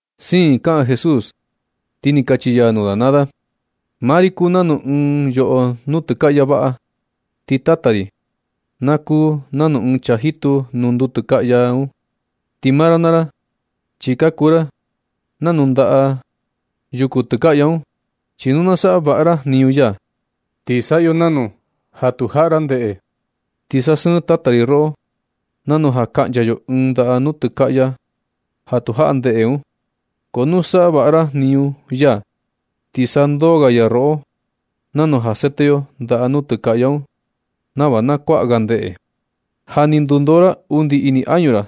Siin kaꞌan Jesús, ti ni kachi ya nuu da naa da: ―Maa ri na kuu nanu ɨɨn yoꞌo nuu nutɨkaꞌya vaꞌa, ti Tata ri na kuu nanu ɨɨn chaa jitu nuu nutɨkaꞌya un. Ti maa ra naa ra, chi ka kuu ra nanu ndaꞌa yuku tɨkaꞌya un. Chi nu tu saꞌa vaꞌa ra jniñu ya, ti saꞌa yo nanu ja tu jaꞌa ra ndeꞌe, ti sasɨɨn Tata ri roꞌo, nanu ja kaꞌncha yo ɨɨn ndaꞌa nuu tɨkaꞌya ja tu jaꞌa ndeꞌe un. Ko nu saꞌa vaꞌa ra jniñu ya, ti sandoo ga ya roꞌo, nanu ja sete yo ndaꞌa nuu tɨkaꞌya un nava na kuaꞌa ga ndeꞌe. Ja ni ka ndundoo ra undi ini añu ra,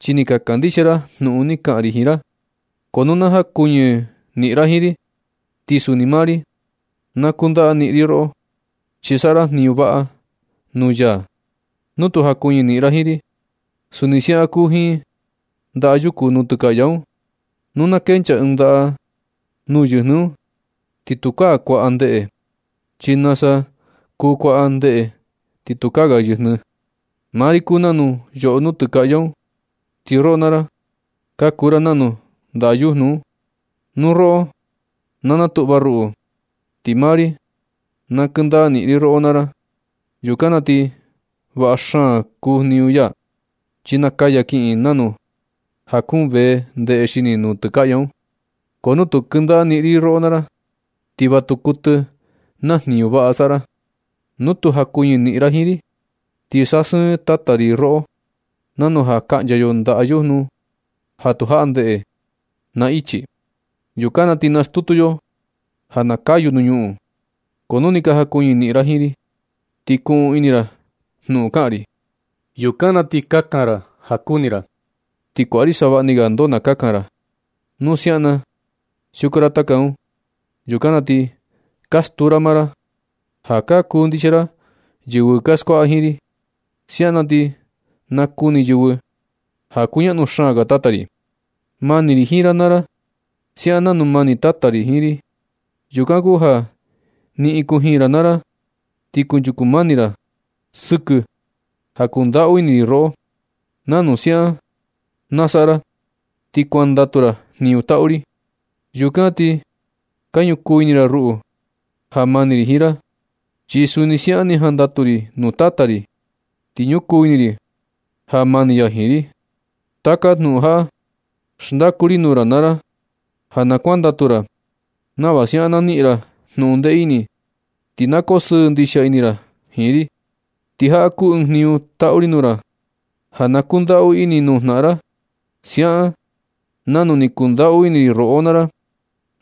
chi ni ka kandixia ra jnuꞌun ni kaꞌan ri jiin ra. Ko nu na jakuñɨ niꞌin ra jiin ri, ti suni maa ri na kundaka niꞌin ri roꞌo, chi saꞌa ra jniñu vaꞌa nuu ya nu tu jakuñɨ niꞌin ra jiin ri. Suni siaꞌan kuu jiin ndaꞌa yuku nuu tɨkaꞌya un. Nu na kencha ɨɨn ndaꞌa nuu yɨjnɨɨ un, ti tukaa kuaꞌa ndeꞌe, chi nasa kuu kuaꞌa ndeꞌe ti tukaa ga yɨjnɨɨ. Maa ri kuu nanu yoꞌo nuu tɨkaꞌya un, ti roꞌo naa ra ka kuu ra nanu ndaꞌa yujnu un. Nu roꞌo na natuꞌva ruꞌu, ti maa ri na kɨndaꞌa niꞌin ri roꞌo naa ra. Yukan na ti vaꞌa xaan kuu jniñu ya, chi nakaya kiꞌin, nanu ja kuun vee ndeꞌe xini nuu tɨkaꞌya un. Ko nu tu kɨndaꞌa niꞌin ri roꞌo naa ra, ti va tu kuɨtɨ na jniñu vaꞌa saꞌa ra. Nu tu jakuñɨ niꞌin ra jiin ri, ti sasɨɨn Tata ri roꞌo, nanu ja kaꞌncha yo ndaꞌa yujnu ja tu jaꞌa ndeꞌe, na ichi. Yukan na ti nastutu yo ja na kayu nuu ñuꞌun. Ko nu ni ka jakuñɨ niꞌin ra jiin ri, ti kuꞌun ini ra jnuꞌun kaꞌan ri. Yukan na ti kakan ra ja kuni ra, ti kuaꞌa ri savaꞌni ga ndoo na kakan ra. Nu siaꞌan na siuku ra taka un, yukan na ti ka stuu ra maa ra ja ka kundixia ra yɨvɨ ka skuaꞌa jiin ri. Siaꞌan na ti nakuni yɨvɨ ja kuñaꞌnu xaan ga Tata ri. Mani ri jiin ra naa ra siaꞌan nanu mani Tata ri jiin ri. Yukan kuu ja niꞌin kujiin ra naa ra ti kunchuku mani ra sɨkɨ ja kundaꞌu ini ri roꞌo. Nu siaꞌan na saꞌa ra ti kuandatu ra jniñu taꞌu ri. Yukan ti ka ñukuu ini ra ruꞌu ja mani ri jiin ra. Chi suni siaꞌan ni jandatu ri nuu Tata ri, ti ñukuu ini ri ja mani ya jiin ri. Taka jnuꞌun jaꞌa xndaku ri nuu ra naa ra ja na kuandatu ra, nava siaꞌan na niꞌin ra jnuꞌun ndee ini ti na koo sɨɨ ndixia ini ra jiin ri. Ti jaꞌa kuu ɨɨn jniñu taꞌu ri nuu ra, ja na kundaꞌu ini nuu jnaꞌan ra, siaꞌan nanu ni kundaꞌu ini ri roꞌo naa ra.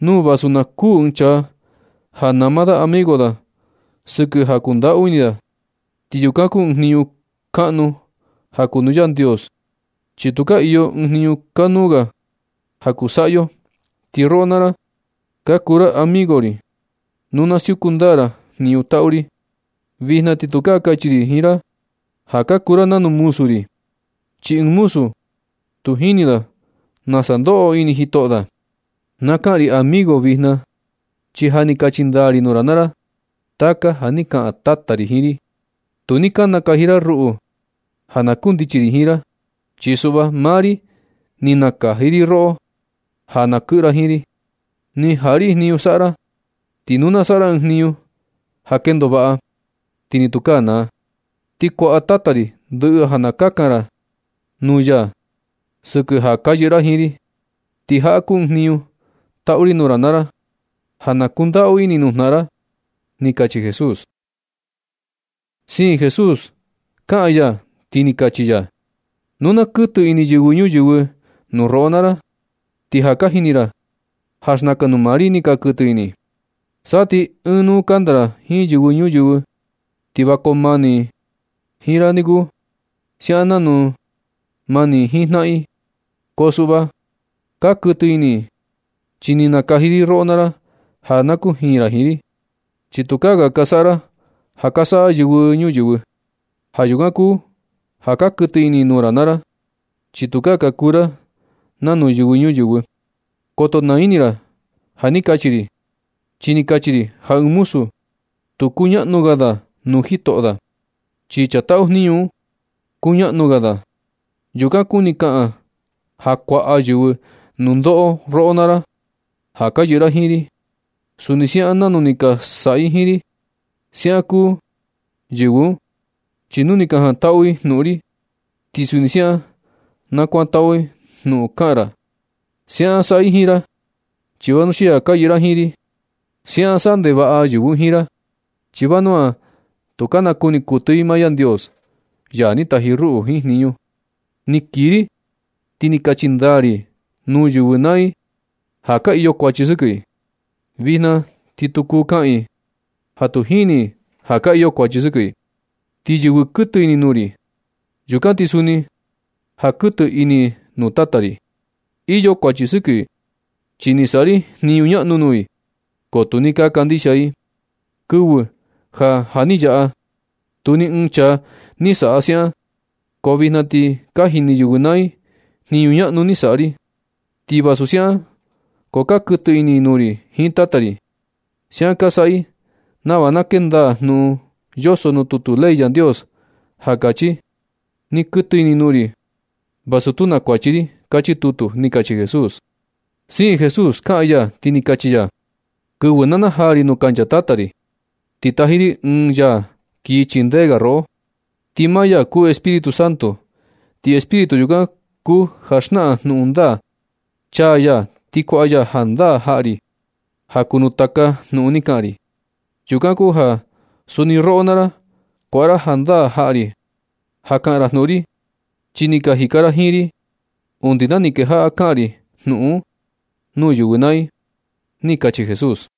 Nu vasu na kuu ɨɨn chaa, ja nama da amigo da sɨkɨ ja kundaꞌu ini da, ti yukan kuu ɨɨn jniñu kaꞌnu ja kuu nuu Yandios. Chi tukaa iyo ɨɨn jniñu kanuu ga ja kuu saꞌa yo. Ti roꞌo naa ra, ka kuu ra amigo ri nu ka siuku ndaa ra jniñu taꞌu ri. Vijna ti tukaa kachi ri ja ka kuu ra nanu muzu ri, chi ɨɨn muzu tu jini da nasa ndoꞌo ini jitoꞌo da. Na kaꞌan ri amigo vijna na, chi ja ni kachi ndaa ri nuu ra naa ra taka ja ni kaꞌan Tata ri jiin ri. Tu ni ka nakaji ra ruꞌu ja na kundichi ri jiin ra. Chi suꞌva, maa ri ni nakaji roꞌo ja na kɨꞌɨ ra jiin ri. Ni jaꞌa ri jniñu saꞌa ra, ti nu na saꞌa ra ɨɨn jniñu ja kendo vaꞌa, ti ni tukaa naa. Ti kuaꞌa Tata ri ndɨꞌɨ ja na kakan ra nuu ya sɨkɨ ja ka yɨꞌɨ ra jiin ri. Ti jaꞌa kuu ɨɨn jniñu taꞌu ri nuu ra naa ra, ja na kundaꞌu ini nuu jnaꞌan ra ―ni kachi Jesús. Siin Jesús kaꞌan ya, ti ni kachi ya: ―Nu na kuɨtɨ ini yɨvɨ ñuyɨvɨ nuu roꞌo naa ra, ti ja ka jini ra ja xnakan nuu maa ri ni ka kuɨtɨ ini i. Sa ti ɨɨn nu kanda ra jiin yɨvɨ ñuyɨvɨ, ti va koo mani i jiin ra niku, siaꞌan nanu mani i jiin jnaꞌan i. Ko suꞌva, ka kuɨtɨ ini i chi ni nakaji ri roꞌo naa ra ja na kujiin ra jiin ri. Chi tukaa ga ka saꞌa ra ja ka saꞌa yɨvɨ ñuyɨvɨ un. Ja yukan kuu ja ka kuɨtɨ ini i nuu ra naa ra, chi tukaa ka kuu ra nanu yɨvɨ ñuyɨvɨ. Koto naa ini ra ja ni kachi ri, chi ni kachi ri ja ɨɨn muzu tu kuñaꞌnu ga da nuu jitoꞌo da, chi chaa taꞌu jniñu un, kuñaꞌnu ga da. Yukan kuni kaꞌan ja kuaꞌa yɨvɨ nundoꞌo roꞌo ra naa ra, ja ka yɨꞌɨ ra jiin ri, suni siaꞌan nanu ni ka saꞌa i jiin ri. Siaꞌan kuu yɨvɨ un, chi nu ni ka jantaꞌu i jnuꞌun ri, ti suni siaꞌan na kuantaꞌu jnuꞌun kaꞌan ra. Siaꞌan saꞌa i jiin ra chi vanuxia ka yɨꞌɨ ra jiin ri. Siaꞌan saꞌa ndevaꞌa yɨvɨ un jiin ra, chi vanua tu ka nakuni kuɨtɨ i maa Yandios, ya ni taji ruꞌu jiin jniñu. Ni kii ri ti ni kachi ndaa ri nuu yɨvɨ naa i ja ka iyo kuachi sɨkɨ i. Vijna ti tu kuu kaꞌan i ja tu jini i ja ka iyo kuachi sɨkɨ i. Ti yɨvɨ kuɨtɨ ini nuu ri, yukan ti suni ja kuɨtɨ ini i nuu Tata ri. Iyo kuachi sɨkɨ i chi ni saꞌa ri jniñu ñaꞌnu nuu i, ko tu ni ka kandixia i. Kɨvɨ ja ja ni yaꞌa, tu ni ɨɨn chaa ni saꞌa siaꞌan, ko vijna ti ni ka jini yɨvɨ naa i jniñu ñaꞌnu ni saꞌa ri. Ti vasu siaꞌan ko ka kuɨtɨ ini i nuu ri jiin Tata ri. Siaꞌan ka saꞌa i nava na kee ndaa jnuꞌun yoso nuu tutu ley Yandios, ja kachi: “Ni kuɨtɨ ini i nuu ri, vasu tu na kuachi ri”, kachi tutu ―ni kachi Jesús. Siin Jesús kaꞌan ya, ti ni kachi ya: ―Kɨvɨ na najaa ri nuu kancha Tata ri, ti taji ri Ɨɨn ya kii chindee ga roꞌo, ti maa ya kuu Espíritu Santo, ti Espíritu yukan kuu ja xnaꞌan jnuꞌun ndaa. Chaa ya ti kuaꞌa ya jandaa jaꞌa ri ja kuu nuu taka jnuꞌun ni kaꞌan ri. Yukan kuu ja suni roꞌo naa ra, kuaꞌa ra jandaa jaꞌa ri ja kaꞌan ra jnuꞌun ri, chi ni ka jika ra jiin ri undi na ni kejaꞌa kaꞌan ri jnuꞌun un nuu yɨvɨ naa i ―ni kachi Jesús.